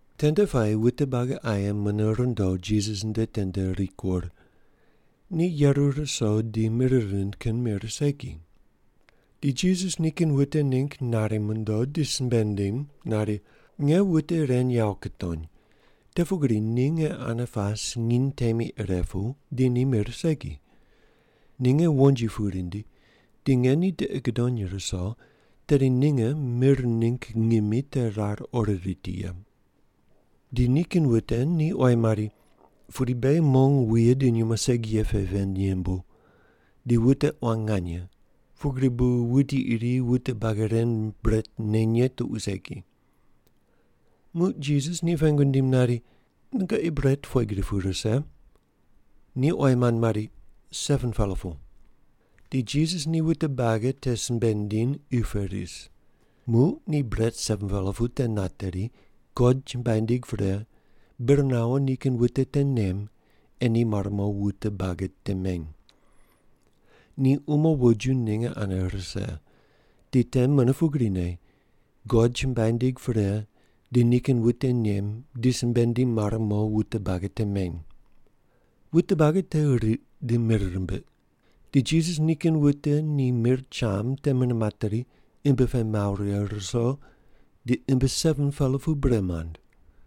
Tende puayi wute buagi aye mune rundo Jisas nde tende rikur. Ni yeru ruso di mir rind kin mir segi. Di Jisas nikin wute ningg nari mondo di simbe nindim nari, “Nge wute ren yawo kutony, te pugri ni nge ane pas nginy temi ire pu, di ni mir segi. Ninge wonji pu rindi di nge ni tiqi gudony ruso, tedi ninge mir ningg ngimi te rar ori riti ye.” Di nikin wute ni oyi mari, “Pudi beghi mong wuye di nyumo segi ye pe ven yembu, di wute quan nganye, pugri bu wuti iri wute buagi ren bret neny ye tuqui segi.” Muq Jisas ni pengu nindim nari, “Nungoqi bret pughe gri pu rise?” Ni oyi mand mari, “7-pela pu.” Di Jisas ni wute buagi te simbe nindiny qi pe ris. Muq ni bret 7-pela pu te nateri, God chumbuai nindig pre, bir nawo nikin wute te nem, ei ni mare mo wute buagi te meny. Ni umo woju ninge ane rise, di te mune pugrine, God chumbuai nindig pre di nikin wute nem di simbe nindim mare mo wute buagi te meny. Wute buagi te riq di mir rimbiq. Di Jisas nikin wute ni mir cham te mune materi imbi pe mawo righe ruso di imbi 7-pela pu bre mand.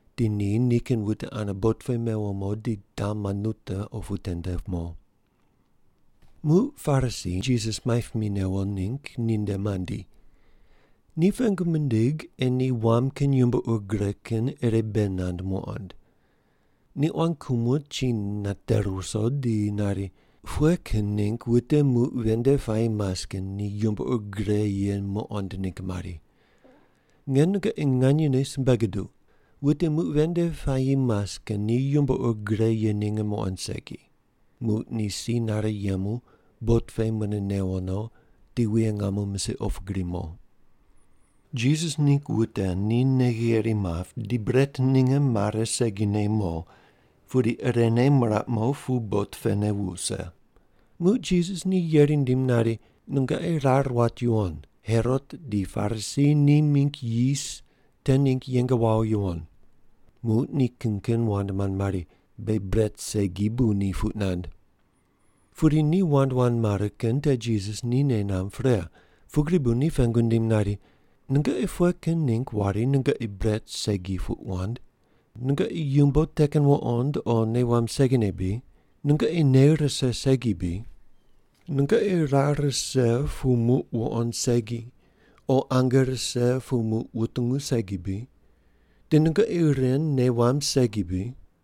di ni nikin wute ane bot pe mewo mo di Dalmanuta opu tende mo. Muq Parisi Jisas maip mi newo ningg ni nde mandi. Ni pengu mindig ei ni wam kin yumbo ur gre kin ire bei nand muqond. Ni quan kumo chi nate ruso di nari, “Pughe kin ningg wute muq ven nde puayi mas kin ni yumbo ur gre ye muqond ningg mari? Nge nungoqi nganyene simbe guduq, wute muq ven nde puayi mas kin ni yumbo ur gre ye ninge muqond segi ye.” Muq ni si nare yemu bot pe mune newo no di wuye ngamo misiq opu gri mo. Jisas ningg wute ni nei gheri map di bret ninge mare segine mo, pudi irene miraq mo pu bot pene wuse. Muq Jisas ni yeri nindim nari, “Nungoqi rar wat yuwon, Herot di Parisi ni mingg yis te ningg yeng wawo yuwon.” Muq ni kin kin wand mand mari, “Beghi bret segi bu ni puq nand.” Pudi ni wand wand mare kin te Jisas ni nei namb pre, pugri bu ni pengu nindim nari, “Nungoqi pughe kin ningg wari nungoqi bret segi puq wand? Nungoqi yumbo te kin wuqond o nei wamb segine bri? Nungoqi nei rise segi bri? Nungoqi rar rise pu muq wuqond segi, o ange rise pu muq wutungu segi bri? Di nungoqi ren nei wamb segi bri?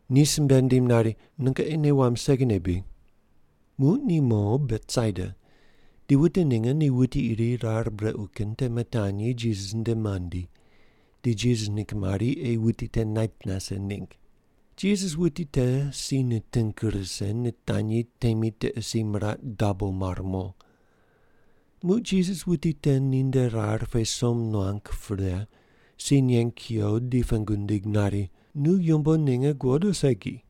Ni simbe nindim nari, “Nungoqi nei wamb segine bri?” Muq ni mo Betsaida di wute ninge ni wuti iri rar brequ kin te mitanyi Jisas nde mandi di Jisas ningg mari ei wuti te nait nase ningg. Jisas wuti te si niting rise nitanyi temi tiqe si miraq dabo mar mo. Muq Jisas wuti te ninde rar pe som nuang pre, si neng kuyo di pengu nindig nari, “Nu yumbo ninge guqod o segi?”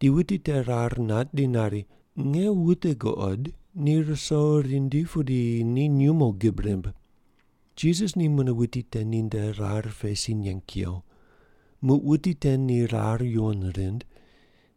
Di wuti te rar nat di nari, “Nge wute guqod, ni ruso rindi pudi ni nyumo gib rimb.” Jisas ni mune wuti te ninde rar pe si neng kuyo. Muq wuti te ni rar yuwon rind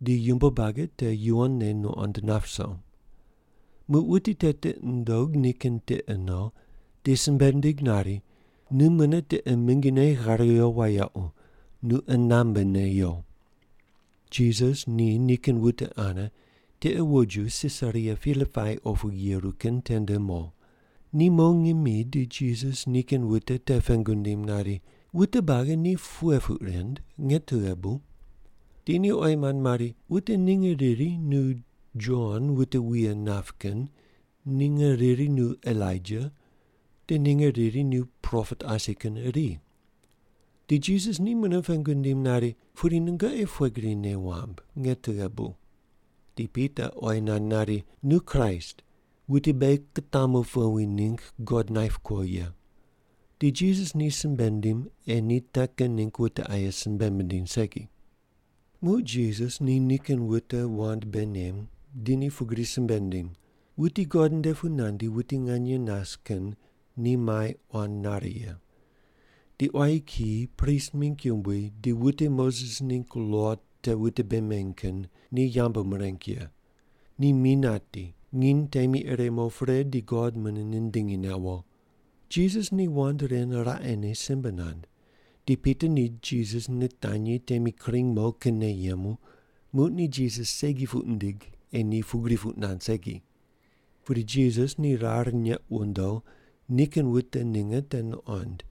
di yumbo buagi te yuwonne nuqond nap ruso. Muq wuti te tiqi nundog nikin tiqe no di simbe nindig nari, “Nu mune tiqe mingine ghar yo wayequ, nu qunambe ne yo.” Jisas ni nikin wute ane tiqe woju Sisaria Pilipai opu yeru kin tende mo. Ni mo ngimi di Jisas nikin wute te pengu nindim nari, “Wute buagi ni pughe puq rind, nge tughe bu?” Di ni oyi mand mari, “Wute ninge riri nu Jon wute wuye nap kin, ninge riri nu Elaija, di ninge riri nu propet asi kin iri.” Di Jisas ni mune pengu nindim nari, “Pudi nungoqi pughe gri nei wamb, nge tughe bu?” Di Pita oyi nand nari, “Nu Kraist, wuti beghi kutamu powi ningg God naip kuo ye.” Di Jisas ni simbe nindim ei ni te kin ningg wute aye simbe mindiny segi. Muq Jisas ni nikin wute wand bei nem, di ni pugri simbe nindim, “Wuti God nde pu nandi wuti nganye nas kin ni mai quan nare ye. Di quayi kiyi, prist mingg yumbui di wute Moses ningg lo te wute bei meny kin ni yambu mireng ye. Ni mi nati, nginy temi ire mo pre di God mune nindingi newo.” Jisas ni wand ren raqene simbe nand, di Pita ni Jisas nitanyi temi kring mo kinne yemu, muq ni Jisas segi puq nindig ei ni pugri puq nand segi. Pudi Jisas ni rar neq wundo nikin wute ninge te nuqond,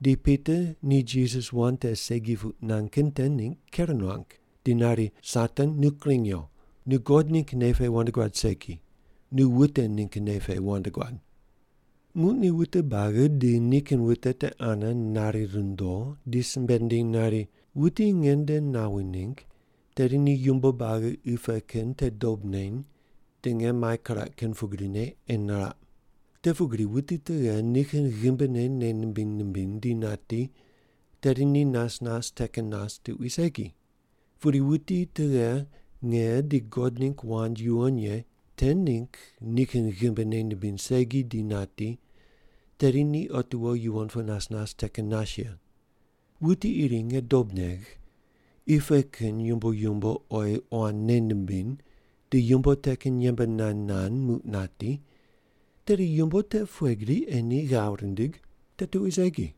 di Pita ni Jisas wand te segi puq nand kin te ningg ker nuang di nari, “Satan nu kring yo. Nu God ningg nei pe wand guad segi, nu wute ningg nei pe wand guad.” Muq ni wute buagi di nikin wute te ane nari rundo di simbe nindiny nari, “Wuti nge nde nawi ningg, tedi ni yumbo buagi qi pe kin te dob neny di nge mai kiraq kin pugrine ei niraq. Te pugri wuti tughe nikin ghimbine nei nimbiny nimbiny di nati tedi ni nas nas te kin nas tuqui segi, pudi wuti tughe nge di God ningg wand yuwon ye te ningg nikin ghimbi nei nimbiny segi di nati tedi ni otiwo yuwon pu nas nas te kin nas ye. Wuti iri nge dob negh, qi pe kin yumbo yumbo oyi quan nei nimbiny, di yumbo te kin yembe nand nand muq nati, tedi yumbo te pughe gri ei ni ghav rindig? Te tuqui segi.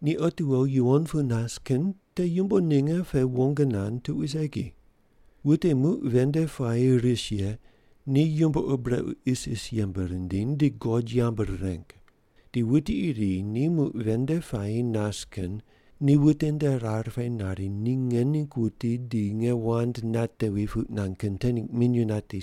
Ni otiwo yuwon pu nas kin te yumbo ninge pe wong nand tuqui segi. Wute muq ven nde puayi ris ye ni yumbo ur brequ isis yembe rindiny di God yambu rireng. Di wuti iri ni muq ven nde puayi nas kin ni wute nde rar pe nari ni nge ningg wuti di nge wand natevi puq nand kin te ningg minyuw nati,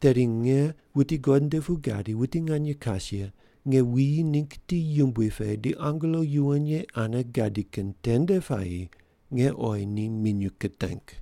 tedi nge wuti God nde pu gadi wuti nganye kas ye nge wuyi ningg ti yumbui pe di angelo yuwon ye ane gadi kin tende puayi nge oyi ni minyuw kiteng.”